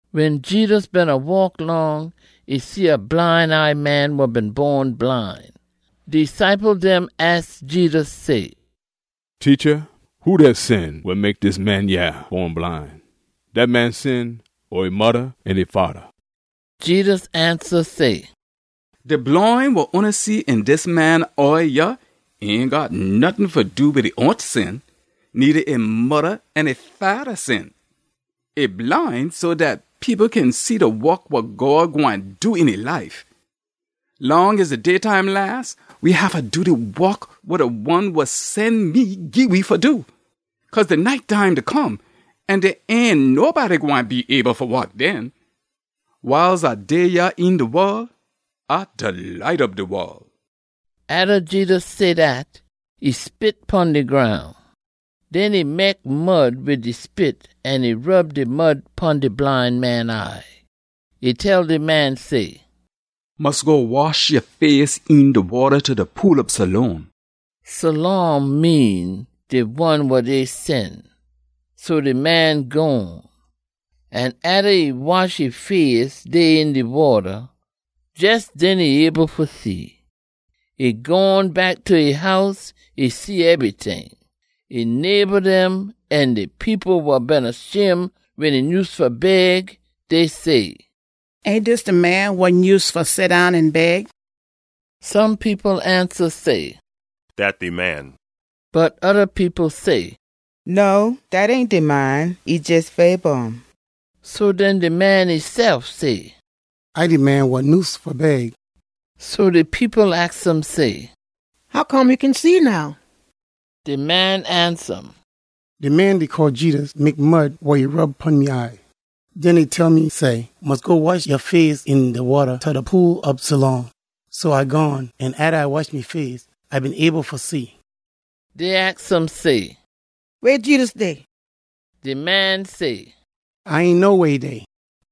Wen Jedus beena waak long, e see a bline eye man wa been bon bline. De ciple dem aks Jedus say, “Teacha, who dat sin wa mek dis man yah bon bline? Dat man sin, or e modda an e fada?” Jedus ansa say, “De bline wa oona see een dis man eye yah ain got nottin fa do wid e own sin, needa e modda an e fada sin. E bline so dat people kin see de wok wa God gwine do een e life. Long as de daytime las, we haffa do de wok wa de one wa sen me gii we fa do. Cause de night time da come, an dey ain nobody gwine be able fa wok den. Wiles A dey yah een de wol, A de light ob de wol.” Atta Jedus say dat, e spit pon de groun. Den e mek mud wid de spit an e rub de mud pon de bline man eye. E tell de man say, “Mus go wash ya face een de wata ta de Pool ob Siloam.” (Siloam mean “De one wa dey sen.”) So de man gone. An atta e wash e face dey een de wata, jes den e able fa see. E gone back ta e house, e see ebryting. E neighba dem an de people wa beena shim wen e nyuse fa beg, dey say, “Ain dis de man wa nyuse fa seddown an beg?” Some people ansa say, “Dat de man.” Bot oda people say, “No, dat ain de man. E jes fabor um.” So den de man esef say, “A de man wa nyuse fa beg.” So de people aks um say, “Hoccome ya kin see now?” De man ansa um, “De man dey call Jedus mek mud wa e rub pon me eye. Den e tell me say, ‘Mus go wash ya face een de wata ta de Pool ob Siloam.’ So A gone, an atta A wash me face, A been able fa see.” Dey aks um say, “Weh Jedus dey?” De man say, “A ain know weh e dey.”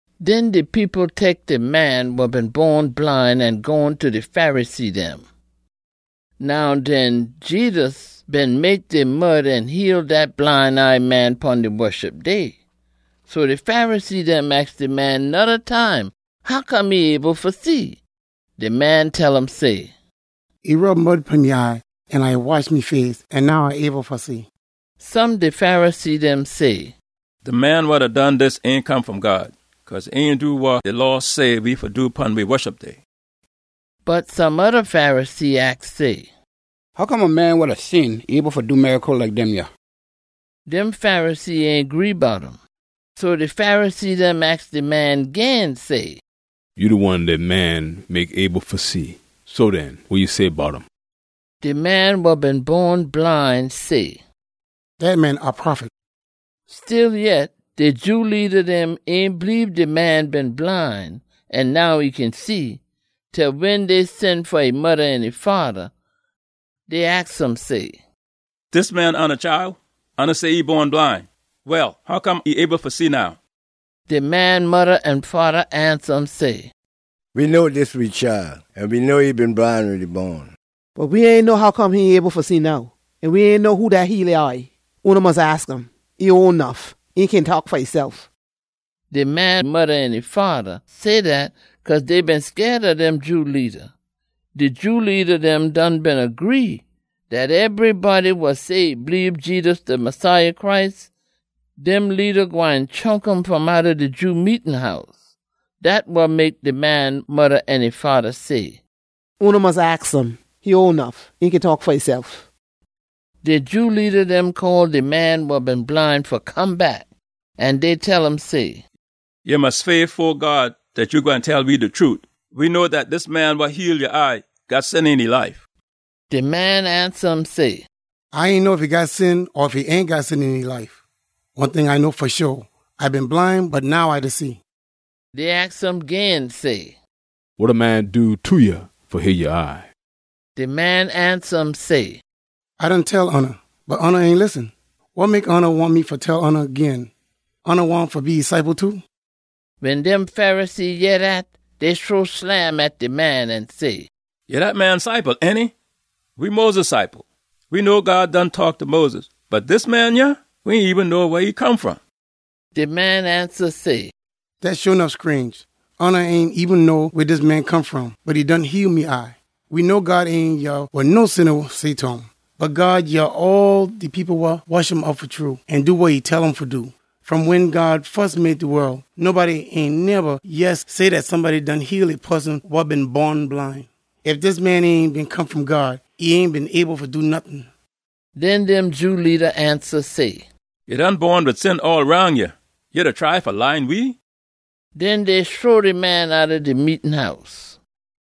Den de people tek de man wa been bon bline an gone ta de Pharisee dem. Now den, Jedus been mek de mud an heal dat bline eye man pon de Woshup Day. So de Pharisee dem aks de man noda time hoccome e able fa see. De man tell um say, “E rub mud pon me eye an A wash me face, an now A able fa see.” Some de Pharisee dem say, “De man wa done dis ain come fom God, cause e ain do wa de Law say we fa do pon de Woshup Day.” Bot some oda Pharisee aks say, “Hoccome a man wa da sin able fa do miracle like dem yah?” Dem Pharisee ain gree bout um. So de Pharisee dem aks de man gin say, “Ya de one dat man mek able fa see. So den, wa ya say bout um?” De man wa been bon bline say, “Dat man a prophet.” Stillyet, de Jew leada dem ain bleebe de man been bline an now e kin see, til wen dey sen fa e modda an e fada. Dey aks um say, “Dis man oona chile? Oona say e bon bline. Well, hoccome e able fa see now?” De man modda an fada ansa um say, “We know dis we chile, an we know e been bline wen e bon. Bot we ain know hoccome e able fa see now. An we ain know who dat heal e eye. Oona mus aks um. E ole nuff. E kin taak fa esef!” De man modda an e fada say dat cause dey been scaid ob dem Jew leada. De Jew leada dem done beena gree dat ebrybody wa say e bleebe Jedus de Messiah Christ, dem leada gwine chunk um fom outta de Jew meetin house. Dat wa mek de man modda an e fada say, “Oona mus aks um. E ole nuff. E kin taak fa esef!” De Jew leada dem call de man wa been bline fa come back, an dey tell um say, “Ya mus sweah fo God dat ya gwine tell we de trute! We know dat dis man wa heal ya eye got sin een e life.” De man ansa um say, “A ain know ef e got sin or ef e ain got sin een e life. One ting A know fa sho. A been bline, bot now A da see.” Dey aks um gin say, “Wa de man do ta ya fa heal ya eye?” De man ansa um say, “A done tell oona, bot oona ain listen. Wa mek oona wahn me fa tell oona gin? Oona wahn fa be e ciple too?” Wen dem Pharisee yeh dat, dey shrow slam at de man an say, “Ya dat man ciple, ainty! We Moses ciple. We know God done taak ta Moses, bot dis man yah, we ain eben know weh e come fom.” De man ansa say, “Dat sho nuff scrange! Oona ain eben know weh dis man come fom, bot e done heal me eye. We know God ain yeh wa no sinna say ta um. Bot God yeh all de people wa woshup um fa true an do wa e tell um fa do. Fom wen God fus mek de wol, nobody ain neba yeh say dat somebody done heal a poson wa been bon bline. Ef dis man ain been come fom God, e ain been able fa do nottin.” Den dem Jew leada ansa say, “Ya done bon wid sin all roun ya. Ya da try fa laan we?” Den dey shrow de man outta de meetin house.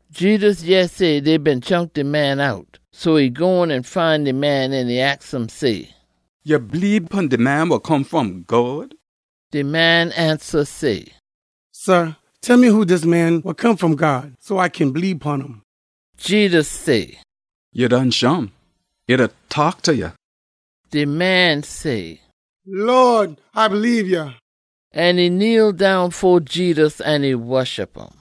Jedus yeh say dey been chunk de man out, so e gone an find de man an e aks um say, “Ya bleebe pon de Man wa Come fom God?” De man ansa say, “Sah, tell me who dis Man wa Come fom God, so A kin bleebe pon um!” Jedus say, “Ya done shim. E da taak ta ya.” De man say, “Lawd, A bleebe ya!” An e kneel down fo Jedus an e woshup um.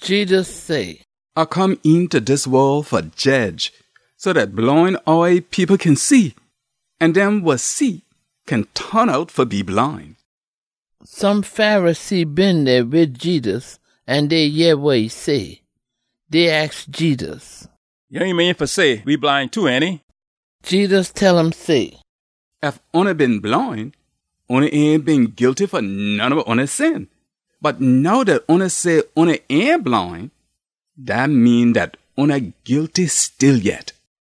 Jedus say, “A come eenta dis wol fa jedge, so dat bline eye people kin see, an dem wa see kin ton out fa be bline.” Some Pharisee been dey wid Jedus an dey yeh wa e say. Dey aks Jedus, “Ya ain mean fa say we bline too, ainty?” Jedus tell um say, “Ef oona been bline, oona ain been guilty fa none ob oona sin. Bot now dat oona say oona ain bline, dat mean dat oona guilty stillyet.”